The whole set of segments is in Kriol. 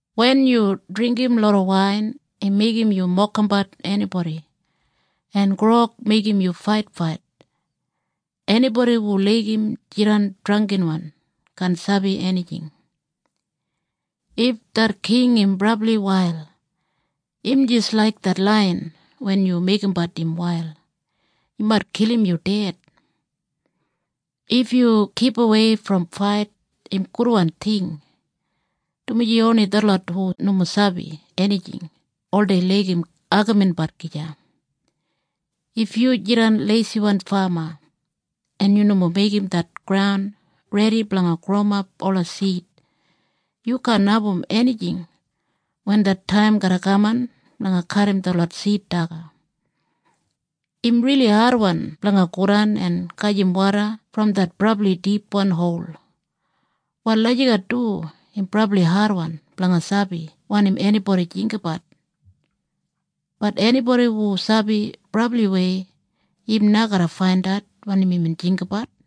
Wen yu dringgim loda wain im meigim yu mokimbat enibodi en grog meigim yu faitfait. Enibodi hu laigim jidan drangginwan kaan sabi enijing. If det king im brabli wail, im jis laik det laiyan wen yu meigimbat im wail. Im mait kilim yu ded. If yu kipawei brom fait im gudwan ting, dumaji oni detlot hu nomo sabi enijing oldei laigim agaminbat gija. If yu jidan leisiwan fama en yu nomo meigim det graun redi blanga growimap ola sid yu kaan abum enijing wen det taim garra kaman blanga kadim detlot sid daga. Im rili adwan blanga godan en gajim woda brom det brabli dipwan hol. Wal lagijat du im brabli adwan blanga sabi wanim enibodi jinggabat, bat enibodi hu sabi brabliwei, im na garra faindat wanim imbin jinggabat.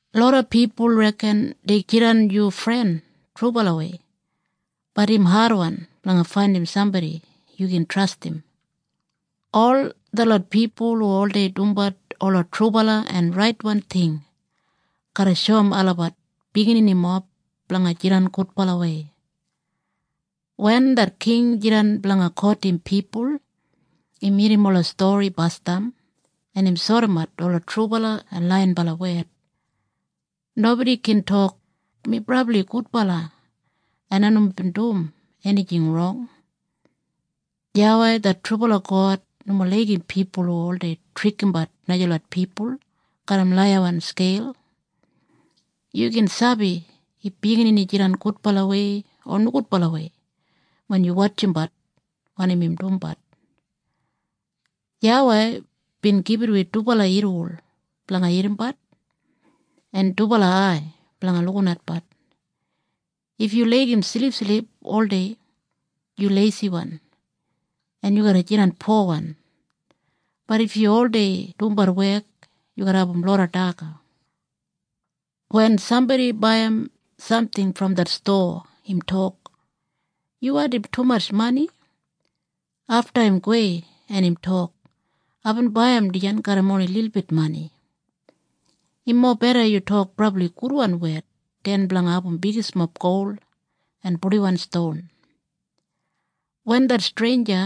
Loda pipul reken dei jidan yu fren trubalawei, bat im adwan blanga faindim sambodi yu gin trastim. Ol detlot pipul hu oldei dumbat ola trubala en raitwan ting garra shoum olabat bigininimob blanga jidan gudbalawei. Wen det king jidan blanga kotim pipul, im irrim ola stori basdam en im sodimat ola trubala en laiyinbala wed. Nobodi gin tok, “Mi brabli gudbala, en ai nomo bin dum enijing rong.” YAWEI det trubala God nomo laigim pipul hu oldei trikimbat najalot pipul garram laiyawan skeil. Yu gin sabi if biginini jidan gudbalawei o nogudbalawei wen yu wotjimbat wanim im dumbat. YAWEI bin gibit wi dubala irriwol blanga irrimbat en dubala ai blanga lukinatbat. If yu laigim silipsilip oldei yu leisiwan en yu garra jidan powan, bat if yu oldei dumbat wek yu garra abum loda daga. Wen sambodi baiyim samting brom det stowa im tok, “Yu wandim tumatj mani.” Afta im gowei en im tok, “Aibin baiyim dijan garram oni lilbit mani.” Im mobeda yu tok brabli gudwan wed den blanga abum bigismob gol en purdiwan ston. Wen det streinja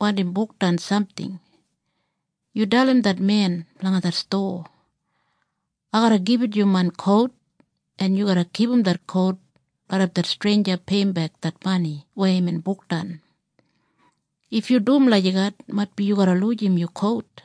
wandim bukdan samting, yu dalim det men blanga det stowa, “Ai garra gibit yu main kout en yu garra kipum det kout raidap det streinja peiyimbek det mani weya imbin bukdan.” If yu dum lagijat maitbi yu garra lujim yu kout!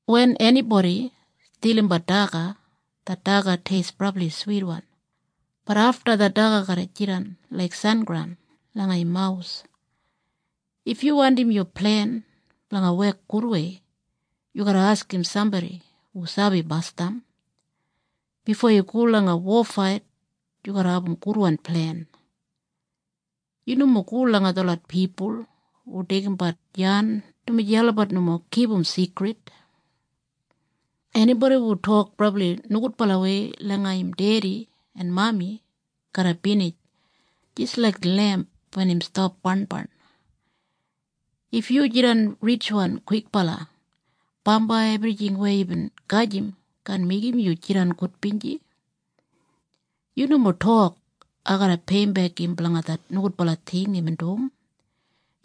Wen enibodi stilimbat daga, det daga teist brabli switwan, bat afta det daga garra jidan laik sengraun langa im mawus. If yu wandim yu plen blanga wek gudwei, yu garra askim sambodi hu sabi basdam. Bifo yu go langa wofait yu garra abum gudwan plen. Yu nomo go langa detlot pipul hu deigimbat yan dumaji olabat nomo kipum sigrid. Enibodi hu tok brabli nogudbalawei langa im dedi en mami garra binij jis laik lemp wen im stap barnbarn. If yu jidan ritjwan kwikbala, bambai ebrijing weya yubin gajim kaan meigim yu jidan gudbinji. Yu nomo tok, “Ai garra peiyimbek im blanga det nogudbala ting imbin dum.”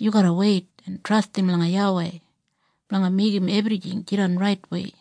Yu garra weit en trastim langa YAWEI blanga meigim ebrijing jidan raitwei.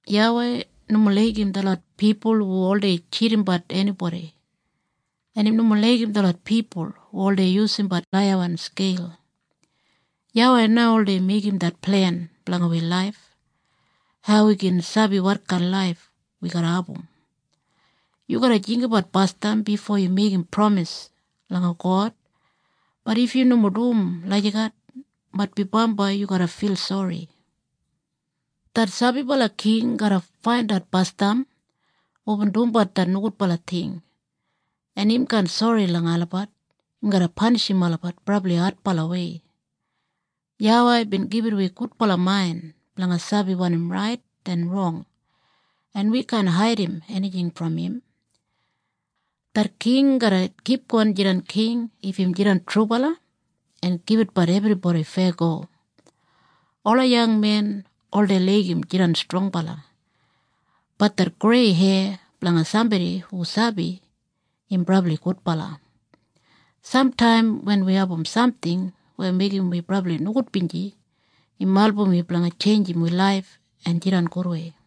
YAWEI nomo laigim detlot pipul hu oldei tjidimbat enibodi en im nomo laigim detlot pipul hu oldei yusumbat laiyawan skeil. YAWEI na oldei meigim det plen blanga wi laif. Hau wi gin sabi wotkain laif wi garra abum? Yu garra jinggabat basdam bifo yu meigim pramis langa God, bat if yu nomo dum lagijat maitbi bambai yu garra fil sori. Det sabibala king garra faindat basdam hubin dumbat det nogudbala ting, en im kaan sori langa olabat. Im garra panishim olabat brabli adbalawei. YAWEI bin gibit wi gudbala main blanga sabi wanim rait en rong, en wi kaan haidim enijing brom im. Det king garra kipgon jidan king if im jidan trubala en gibitbat ebribodi feyago. Ola yangmen oldei laigim jidan strongbala, bat det grei heya blanga sambodi hu sabi, im brabli gudbala. Samtaim wen wi abum samting weya meigim wi brabli nogudbinji im album wi blanga tjeinjim wi laif en jidan gudwei.